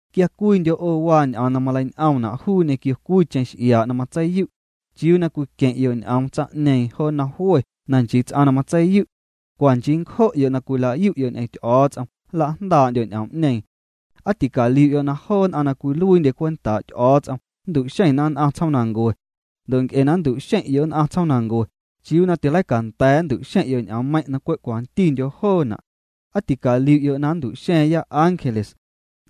Quia cwiindyo' 'o waa ñ'oom na malein'oomna' juu ñequio cwiicheⁿ x'iaa' na matseiyu', ¿chiuu na cwiqueⁿ'yo' ñ'oom tsaⁿ'ñeeⁿ jo nnom jwe na nchii ts'aⁿ na matseiyu'? Cwa nchii ncjo'yo' na cwila'yu'yo' ñ'eⁿ Ty'o̱o̱ts'om nla'jndaa'ndyo' ñ'oom'ñeeⁿ. ¿Aa ticaliu'yo' na joo nn'aⁿ na cwiluiindye cwentaa' Ty'o̱o̱ts'om nntu'xeⁿna nn'aⁿ tsjoomancue? Ndo' nc'e na nntu'xeⁿ'yo' nn'aⁿ tsjoomnancue, ¿chiuu na tileicanda̱a̱ nntu'xeⁿ'yo' ñ'oommeiⁿ' na cwe' cwantindyo joona'? ¿Aa ticaliu'yo' na nntu'xa̱a̱ⁿya ángeles?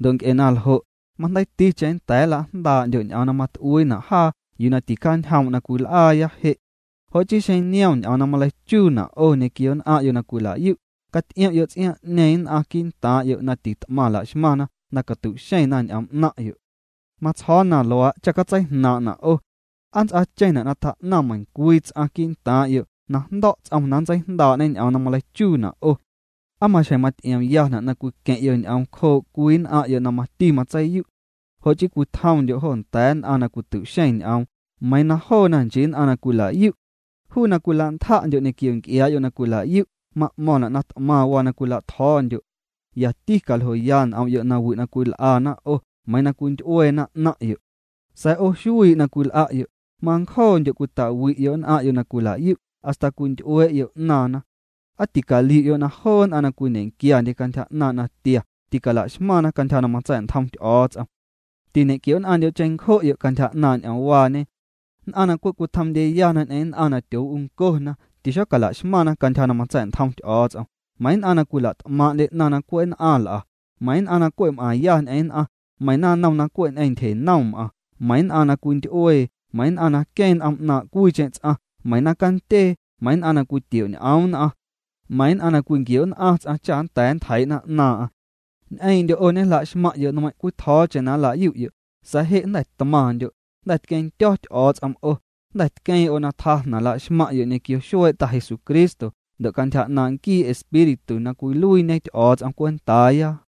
Ndo' nc'e na ljo', majndeiiticheⁿ nnda̱a̱ nla'jndaa'ndyo' ñ'oom na mat'uiina' jaa yuu na ticjaañjoom' na cwil'aaya je'. Jo' chii xeⁿ niom ñ'oom na maleichuuna' 'o ñequio nn'aⁿ'yo' na cwilayu', caty'iom'yo' ts'iaaⁿ'ñeeⁿ nn'aⁿ quii'ntaaⁿ'yo' na tit'maⁿ la'xmaⁿ na catu'xeⁿna ñ'oom 'naⁿ'yo'. Matsjo̱o̱ na luaa' cha catseijnaaⁿ'na' o'. ¿Aa nnts'aacheⁿna' na tjaa'naⁿ meiⁿñecwii ts'aⁿ quii'ntaaⁿ'yo' na jndo̱' ts'om na nntseijndaa'ñê ñ'oom na maleichuuna' 'o? ¿Aa maxjeⁿ maty'iomyana' na cwiqueⁿ'yo' ñ'oom cjoo' cwii nn'aⁿ'yo' na mati matseiyu'? Jo' chii cwitjomndyo' jo nda̱a̱ nn'aⁿ na cwitu'xeⁿ ñ'oom, meiiⁿ na joona nchii nn'aⁿ na cwila'yu'. Juu na cwila'ntja'ndyo' ñequio nc'iaa'yo' na cwila'yu' ma'mo̱ⁿna' na t'maⁿ waa na cwila'tjo̱o̱ndyo'. Yati caljoya n'om'yo' nawi' na cwil'ana 'o, meiiⁿ na cwinty'ueena 'naⁿ'yo'. Sa̱a̱ 'o xuii' na cwil'a'yo', mancjoondyo' cwita'wi'yo' nn'aⁿ'yo' na cwila'yu' hasta cwinty'uee'yo' 'naaⁿna. ¿Aa ticaliu'yo' na joo nn'aⁿ na cwiñequiandye cantyja 'naaⁿ' natia ticalaxmaⁿna cantyja na matsa̱'ntjom Ty'o̱o̱ts'om? Tiñe'quio'nn'aⁿndyo' cheⁿncjo'yo' cantyja 'naaⁿ' ñ'oomwaañe. Nn'aⁿ na cwe' cwitjomndyeyana ñ'eⁿ nn'aⁿ na tyoo'uncona, tixocala'xmaⁿna cantyja na matsa̱'ntjom Ty'o̱o̱ts'om, meiⁿ nn'aⁿ na cwila't'maaⁿ'ndye 'naⁿ na cwe' nn'aⁿ l'a, meiⁿ nn'aⁿ na cwe' m'aⁿya ñ'eⁿ nn'aⁿ, meiⁿ naⁿnom na cwe' ñ'eⁿ ntyjenom m'aⁿ, meiⁿ nn'aⁿ na cwinty'uee, meiⁿ nn'aⁿ na queeⁿ n'om 'naaⁿ' cwiicheⁿ ts'aⁿ, meiⁿ naⁿcandyee, meiⁿ nn'aⁿ na cwitioñ'oom nn'aⁿ, meiⁿ nn'aⁿ na cwinquio'nn'aⁿ ts'aⁿ cha nnda̱a̱ ntjeii'na 'naaⁿ'aⁿ. Ñ'eeⁿ'ndyo' 'o na ñejla'xmaⁿ'yo' nmeiⁿ' cwitjo̱o̱cheⁿ na nla'yu'yo', sa̱a̱ je' jnda̱ tmaⁿndyo', jnda̱ tqueⁿndyo̱ Ty'o̱o̱ts'om 'o, jnda̱ tqueeⁿ 'o na tjaa jnaⁿ la'xmaⁿ'yo' ñequio xuee' Ta Jesucristo ndo' cantyja 'naaⁿ' nquii Espíritu na cwiluiiñe Ty'o̱o̱ts'om cwentaaya.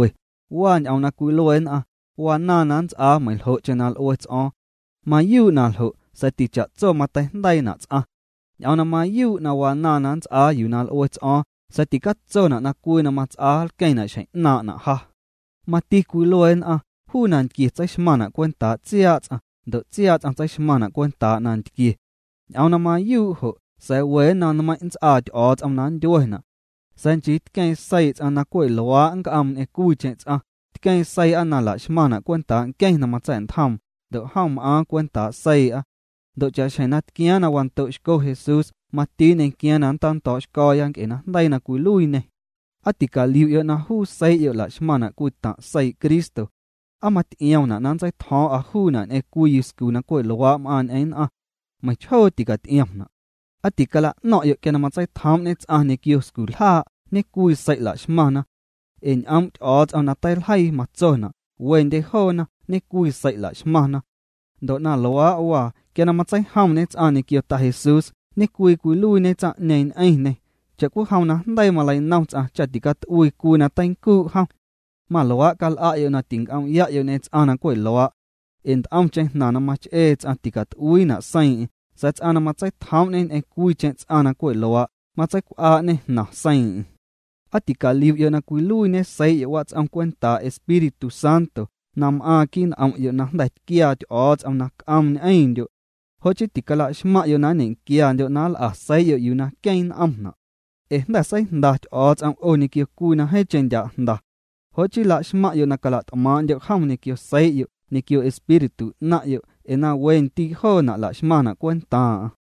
Waa ñ'oom na cwilue nn'aⁿ: “Wanaaⁿ na nnts'aa meiⁿljo'cheⁿ na l'ue ts'o̱o̱ⁿ”. Mayuu' na ljo', sa̱a̱ ticha'tso mateijndeiina' ts'aⁿ. Ñ'oom na mayuu' wanaaⁿ na nnts'aa yuu na l'ue ts'o̱o̱ⁿ sa̱a̱ ticatsona' na cwii na mats'aa nlqueⁿna' xjeⁿ 'naaⁿ'na' ja. Mati cwilue nn'aⁿ: “Juu nantquie tseixmaⁿna' cwentaa' tsiaa' ts'aⁿ, ndo' tsiaa' ts'aⁿ tseixmaⁿna' cwentaa nantquie.” Ñ'oom na mayuu' jo', sa̱a̱ we nnom nmeiⁿ' nnts'aa Ty'o̱o̱ts'om na nndyuena'. Sa̱a̱ nchii tqueeⁿ seii' ts'aⁿ na cwe' luaa' nnc'oom ñ'eⁿ cwiicheⁿ ts'aⁿ, tqueeⁿ seii'a na laxmaⁿna' cwentaa' nqueⁿ na matsa̱'ntjoom, ndo' jom m'aaⁿ cwentaa' seii'a. Ndo' cha'xjeⁿ na tquiaaⁿ na wando'xco Jesús mati nñequiaaⁿ na nntando̱o̱'xco̱o̱ya nc'e najndeii na cwiluiiñê. ¿Aa ticaliu'yo' na juu seii'yo' laxmaⁿna' cwii taⁿ' seii' Cristo? ¿Aa maty'iomna' na nntseitjo̱o̱ⁿ'a juuna' ñ'eⁿ cwii yuscu na cwe' luaa' m'aaⁿ ñ'eⁿ nn'aⁿ? Meiⁿchjoo ticaty'iomna' ¿Aa ticala'no̱ⁿ'yo' quia na matseitjoom'ñe ts'aⁿ ñequio sculjaa', ñe'cwii sei' laxmaⁿna? Ee ñ'oom' Ty'o̱o̱ts'om na teiljeii matsona': “Wendye joona, ñe'cwii sei' la'xmaⁿna.” Ndo' na luaa' waa, quia na matseijomñe ts'aⁿ ñequio Ta Jesús, ñe'cwii cwiluiiñe tsaⁿ'ñeeⁿ ñ'eⁿñê. Cha'cwijom na jndeii maleinom ts'aⁿ cha na ticat'uii cwii na teincuu' jom, maluaa' cal'a'yo' na tic'om'ya'yo' ñ'eⁿ ts'aⁿ na cwe' luaa'. Ee nt'omcheⁿ jnaⁿ na mach'ee ts'aⁿ ticat'uiina' seiiⁿ'eⁿ, sa̱a̱ ts'aⁿ na matseitjoom'ñe ñ'eⁿ cwiicheⁿ ts'aⁿ na cwe' luaa', matseicw'aa'ñê jnaⁿ seiiⁿ'eⁿ. ¿Aa ticaliu'yo' na cwiluiiñe seii'yo' wats'om cwentaa' Espíritu Santo na m'aaⁿ quii' n'om'yo' na jnda̱ tquiaa Ty'o̱o̱ts'om na c'oom ñ'eⁿndyo'? Jo' chii ticalaxmaⁿ'yo' na nñequiandyo' na nl'a seii'yo' yuu na queeⁿ n'omna'. Ee jnda̱ seijnda Ty'o̱o̱ts'om 'o ñequio cwii na jeeⁿcheⁿ ndya' jnda. Jo' chii laxmaⁿ'yo' na cala't'maaⁿ'ndyo' jom ñequio seii'yo' ñequio espíritu 'naⁿ'yo' ee na we ndii' joona' la'xmaⁿna' cwentaaⁿ'aⁿ.